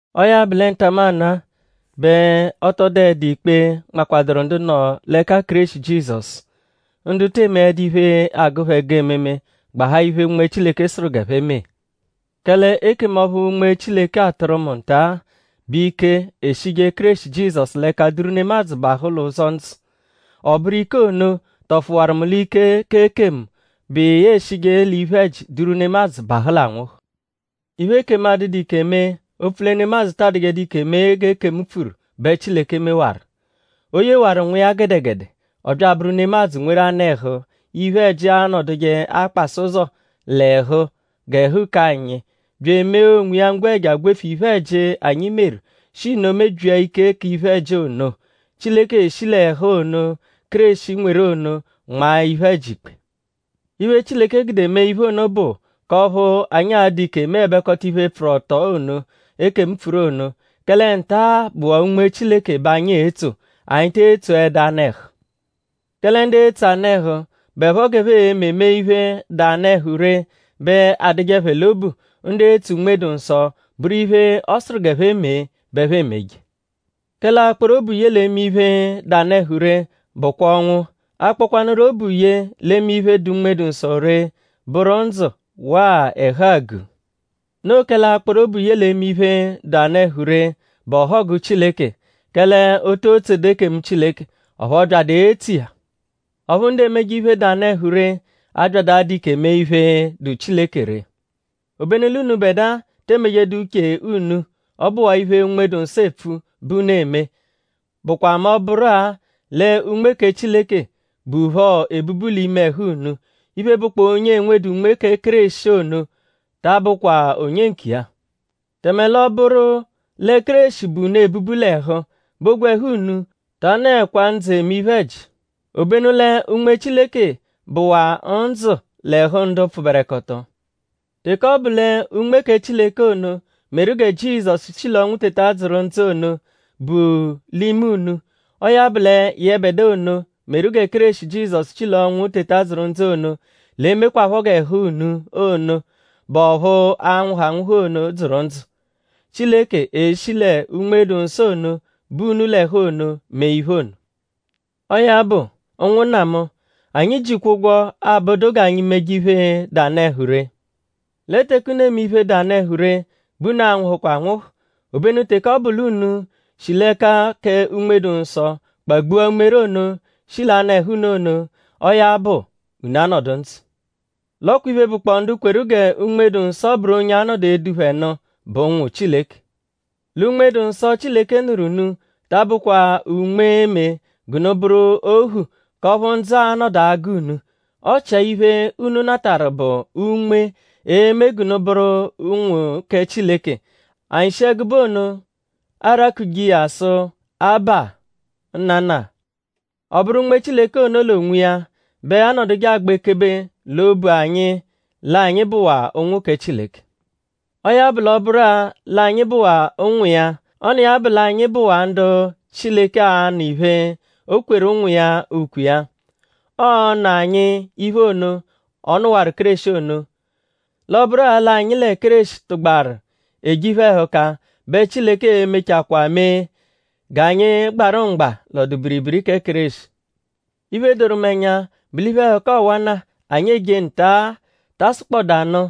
Ọo ya bụ lẹ ntamanụ-a bẹ ọ tọ dụedu ikpe, nmakwadụru ndu nọ l'ẹka Kéreshi Jizọsu; ndu te emeẹdu iphe, agụ phẹ ẹgu ememe; gbahaa iphe, Unme Chileke sụru g'ẹphe mee. Kẹle ekemu ọphu Unme Chileke atụru mu nta-a bụ ike, eshije Kéreshi Jizọsu l'ẹka duru nemadzụ bahụ l'ụzo ndzụ. Ọ bụru ike ono tọfuwaru mu l'ike k'ekemu, bụ iya eshije l'iphe-ẹji duru nemadzụ bahụ l'anwụhu. Iphe, ekemu adụdu ike mee opfu lẹ nemadzụ ta adụjedu ike mee g'ekemu pfuru bẹ Chileke mewaru. O yewaru Nwa iya gẹdegede; ọ bya abụru nemadzụ; nweru anụ-ẹhu, iphe-ẹji anọduje akpasa ụzo l'ẹhu g'ẹhu k'anyi; bya emee onwiya ngwẹja gwefu iphe-ẹji, anyi meru; shi nno mebyia ike k'iphe-ẹji ono. Chileke shi l'ẹhu ono, Kéreshi nweru ono nmaa iphe-ẹji ikpe. Iphe, Chileke gude mee iphe ono bụ k'ọphu anyi a-dụ ike meẹbekota iphe, pfụru ọto ono, ekemu pfuru ono. Kẹle nta bụwaa Unme Chileke bẹ anyi etso; anyi te etsoẹdu anụ-ẹhu. Kẹle ndu etso anụ-ẹhu bụepho g'ẹphe e-me mee iphe, dụ anụ-ẹhu ree bẹ adụje phẹ l'obu. Ndu etso Unme-dụ-Nsọ bụru iphe, ọ sụru g'ẹphe mee bẹ ẹphe emeje. Kẹle akpọru obu ye l'eme iphe, dụ anụ-ẹhu ree bụkwa ọnwu; akpọkwanuru obu ye l'eme iphe, dụ Unme-dụ-Nsọ ree bụru ndzụ waa ẹhu àgù. Noo kẹle akpọru obu ye l'eme iphe, dụ anụ-ẹhu ree bụ ọhogu Chileke; kẹle o too tsodu ekemu Chileke; ọphu ọ byadu etso iya. Ọphu ndu emeje iphe, dụ anụ-ẹhu ree 'abyadu adụ ike mee iphe, dụ Chileke ree. Obenu l'unubẹdua te emejedu uche unu. Ọ bụwaa iphe, Unme-dụ-Nsọ epfu bẹ unu eme; bụkwa mẹ ọ -bụru-a lẹ Unme kẹ Chileke buphọ ebubu l'ime ẹhu unu. Iphe, bụkpoo onye enwedu Unme kẹ Kéreshi ono ta abụkwa onye nkiya. Tẹme l'ọ -bụru lẹ Kéreshi bu unu ebubu l'ẹhu; bẹ ogwẹhu unu ta anọekwa ndzụ eme iphe-ẹji; obenu lẹ Unme Chileke bụwaa ndzụ l'ẹhu ndu pfụberekoto. Teke ọ bụ lẹ Unme kẹ Chileke ono, meru gẹ Jizọsu shi l'ọnwu teta dzụru ndzụ ono, bu l'ime unu; ọo ya bụ lẹ yẹbedua ono, meru gẹ Kéreshi Jizọsu shi l'ọnwu teta dzụru ndzụ ono l'e-mekwaphọ g'ẹhu unu ono, bụ ọphu a-nwụhu anwụhu ono dzụru ndzụ. Chileke e-shi lẹ Unme-dụ-Nsọ ono, bu unu l'ẹhu ono mee iphe ono. Ọo ya bụ; ụnwunna mu; anyi jikwa ụgwo, abụdu g'anyi meje iphe, dụ anụ-ẹhu ree. Lẹ teke unu eme iphe, dụ anụ-ẹhu ree bẹ unu a-nwụhukwa anwụhu. Obenu teke ọ bụ l'unu shi l'ẹka kẹ Unme-dụ-Nsọ kpagbua umere ono, shi l'anụ-ẹhu unu ono; ọo ya bụ; unu anọdu ndzụ. L'ọ kwa iphe, bụkpoo ndu kweru gẹ Unme-dụ-Nsọ bụru onye a-nọdu edu phẹ nụ bụ ụnwu Chileke. Lẹ Unme-dụ-Nsọ, Chileke nụru unu ta abụkwa Unme, e-me g'unu bụru ohu k'ọphu ndzụ a-nọdu agụ unu. Ọchia iphe, unu natarụ bụ Unme, e-me g'unu bụru ụnwu kẹ Chileke; anyi shi ẹgube ono arakuje iya sụ: “Abba! Nnana!” Ọ bụru Unme Chileke ono l'onwiya bẹ anọduje agba ekebe l'obu anyi l'anyi bụwaa ụnwu kẹ Chileke. Ọo ya bụ l'ọ -bụru-a l'anyi bụwaa ụnwu iya; ọ n'iya bụ l'anyi bụwaa ndu Chileke a-nụ iphe, o kweru ụnwu iya ukwe iya. Ọo-nụ anyi iphe ono, ọ nụwaru Kéreshi ono. L'ọ -bụru-a l'anyi lẹ Kéreshi tụgbaru eje iphe-ẹhuka bẹ Chileke e-mechakwaa mee g'anyi gbarụ mgba l'ọdu-biribiri kẹ Kéreshi. Iphe, doru mu ẹnya bụ l'iphe-ẹhuka ọwana, anyi eje nta-a ta asụkpoda nụ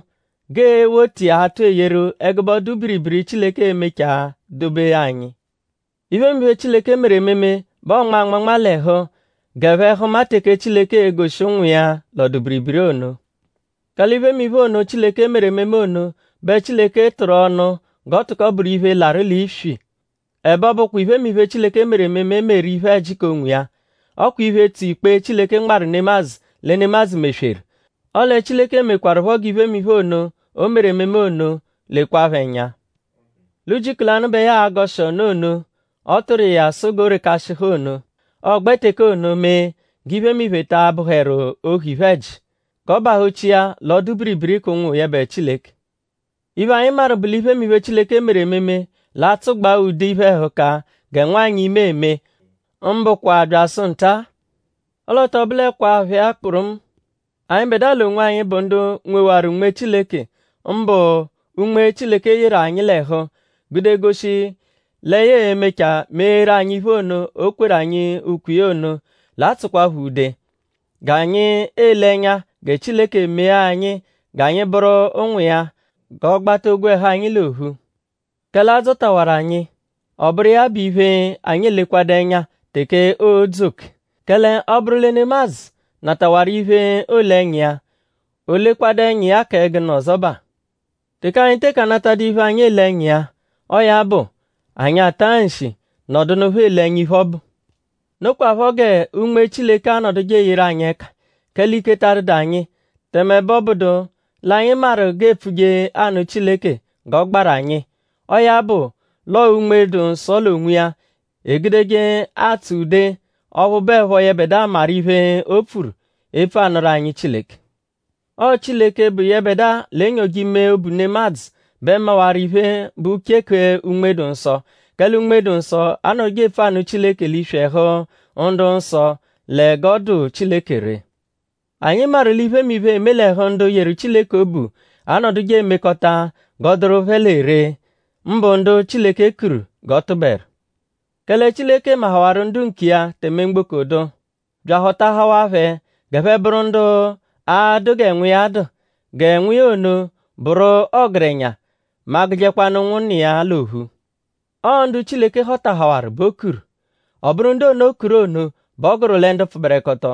g'ee-wota iya atụ eyeru ẹgube ọdu-biribiri, Chileke e-mechaa dobe anyi. Iphemiphe, Chileke meru ememe bẹ ọonma anmanma l'ẹhu g'ẹphe hụma teke Chileke e-goshi ụnwu iya l'ọdu-biribiri ono. Kẹle iphemiphe ono, Chileke meru ememe ono bẹ Chileke tụru ọnu g'ọ tụko bụru iphe, larụ l'iswi. Ẹbe ọ bụkwa iphemiphe, Chileke meru ememe meru iphe-ẹji k'onwiya. Ọ kwa iphe, tso ikpe, Chileke nmarụ nemadzụ lẹ nemadzụ mesweru. Ọle Chileke mekwarụpho g'iphemiphe ono, o meru ememe ono lekwaphọ ẹnya l'ujiku lanụ bẹ ya a-gọshi ọnu ono, ọ tụru iya sụ g'o rekashịhu ono. Ọogbe teke ono mee g'iphemiphe ta abụheru ohu iphe-ẹji; g'ọ bahụ-chia l'ọdu-biribiri k'ụnwu yẹbe Chileke. Iphe, anyi maru bụ l'iphemiphe, Chileke meru ememe l'atsụgbaa ude iphe-ẹhuka gẹ nwanyị, ime eme; mbụkwa byasụ nta-a. Ọle ọ tọ bụlekwaa phẹ-a kpụrumu. Anyịbedua l'onwanyi, bụ ndu nwewaru Unme Chileke; mbụ Unme, Chileke yeru anyi l'ẹhu gude goshi lẹ ya e-mechaa meeru anyi iphe ono, o kweru anyi ukwe iya ono; l'atsụkwapho ude; g'anyi ele ẹnya gẹ Chileke mee anyi g'anyi bụru ụnwu iya, g'ọ gbata ogwẹhu anyi l'ophu. Kẹle a dzọtawaru anyi; ọ bụru iya bụ iphe, anyi elekwadu ẹnya teke oo-dzu oke. Kẹle ọ -bụru lẹ nemadzụ natawaru iphe, oole ẹnya iya;?o lekwadụ ẹnya iya kẹ gụnu ọzobaa? Teke anyi teke anatadụ iphe, anyi ele ẹnya iya; ọo ya bụ; anyi ata nshi nọdunupho ele ẹnya iphe ọbu. Nokwaphọ gẹ Unme Chileke anọduje eyeru anyi ẹka; kẹle ike ta adụdu anyi; tẹme ẹbe ọ bụdu l'anyi maru g'e pfuje anụ Chileke g'ọ gbaru anyi. Ọo ya bụ l'ọo Unme-dụ-Nsọ l'onwiya egudeje atsụ ude ọphu bụepho yẹbedua maru iphe, o pfuru epfu anụru anyi Chileke. Ọo Chileke, bụ yẹbedua, l'enyoje ime obu nemadzụ bẹ mawaru iphe, bụ uche kẹ Unme-dụ-Nsọ; kẹle Unme-dụ-Nsọ anọduje epfu anụ Chileke l'iswi ẹhu ndu-nsọ lẹ g'ọ dụ Chileke ree. Anyi maru l'iphemiphe, eme l'ẹhu ndu yeru Chileke obu anọduje emekọta g'ọo-dụru phẹ lẹ ree; mbụ ndu Chileke kuru g'ọ tụberu. Kẹle Chileke mahawarụ ndu nkiya tẹme mgboko dụ; bya ahọtahawaa phẹ g'ẹphe bụru ndu a-dụ gẹ Nwa iya dụ; gẹ Nwa iya ono bụru ọgerenya mẹ a -gụjekwanu ụnwunna iya l'ophu. Ọo ndu Chileke họtahawaru bẹ o kuru. Ọ bụru ndu ono, o kuru ono bẹ ọ gụru lẹ ndu pfụberekoto.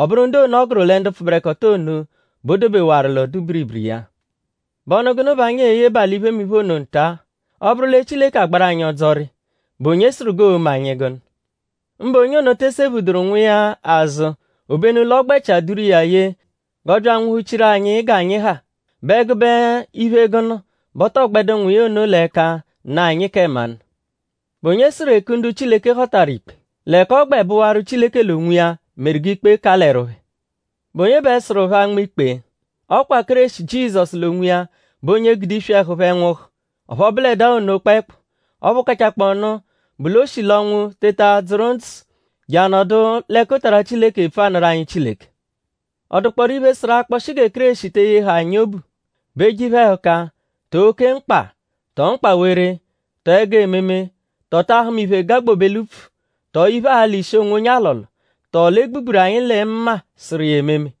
Ọ bụru ndu ono, ọ gụru lẹ ndu pfụberekoto ono bẹ o dobewaru l'ọdu-biribiri iya. ?Bụ ọnu gụnu bẹ anyi e-yebaa l'iphemiphe ono nta? Ọ -bụru lẹ Chileke agbaru anyi ọdzori;?bụ onye sụru g'oo-me anyi gụnu? Mbụ onye ono te sephuduru Nwa iya azụ; obenu l'ọ gbẹchia duru iya ye g'ọ bya anwụhu-chiru anyi g'anyi ha.?Bụ ẹgube iphe gụnu bẹ ọ tọo gbẹdu Nwa iya ono l'ẹka nụ anyi kẹ mmanụ? ?Bụ onye sụru eku ndu Chileke họtaru ikpe? L'ẹka ọ gbẹ bụwaru Chileke l'onwiya meru g'ikpe kalẹru phẹ. ?Bụ onye bẹ sụru phẹ anma ikpe? Ọo kwa Kéreshi Jizọsu l'onwiya bụ onye gude iswi ẹhu phẹ nwụhu. Ọphu ọ bụledaa ono kpẹekpu; ọphu kachaakpọnu bụ l'o shi l'ọnwu teta dzụru ndzụ je anọdu l'ẹkutara Chileke epfu anụru anyi Chileke. ?Ọ dụkpooru iphe, sụru akpọshi gẹ Kéreshi te eyehẹ anyi obu??Bụ eje iphe-ẹhuka; tọo oke mkpa; tọo mkpawere; tọo ẹgu ememe; tọo ta ahụma iphe, gagbobe l'upfu??tọo iphe, alọ ishi onwonye alọlo??Tọo l'e gbugburu anyi lẹ mma sụru iya ememe?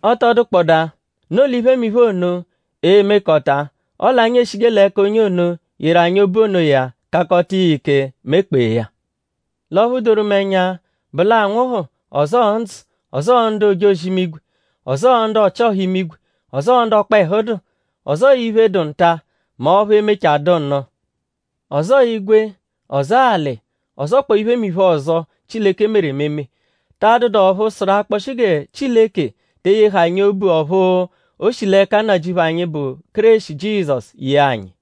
Ọ tọ dụkpodaa; noo l'iphemiphe ono e-mekọta; ọle anyi eshije l'ẹka onye ono, yeru anyi obu onoya kakọta iya ike; mekpee ya. L'ọphu doru mu ẹnya bụ l'anwụhu; ọzoo ndzụ; ọzoo ndu ojozi-imigwe; ọzoo ndu ọchi-ọha imigwe; ọzoo ndu ọkpehu dụ; ọzoo iphe, dụ nta; mẹ ọphu e-mechaa dụ nụ; ọzoo igwe; ọzoo alị; ọzokpoo iphemiphe ọzo, Chileke meru ememe; ta adụdu ọphu sụru akpọshi gẹ Chileke te eyehẹ anyi obu ọphu, o shi l'ẹka Nnajịuphu anyi, bụ Kéreshi Jizọsu yee anyi.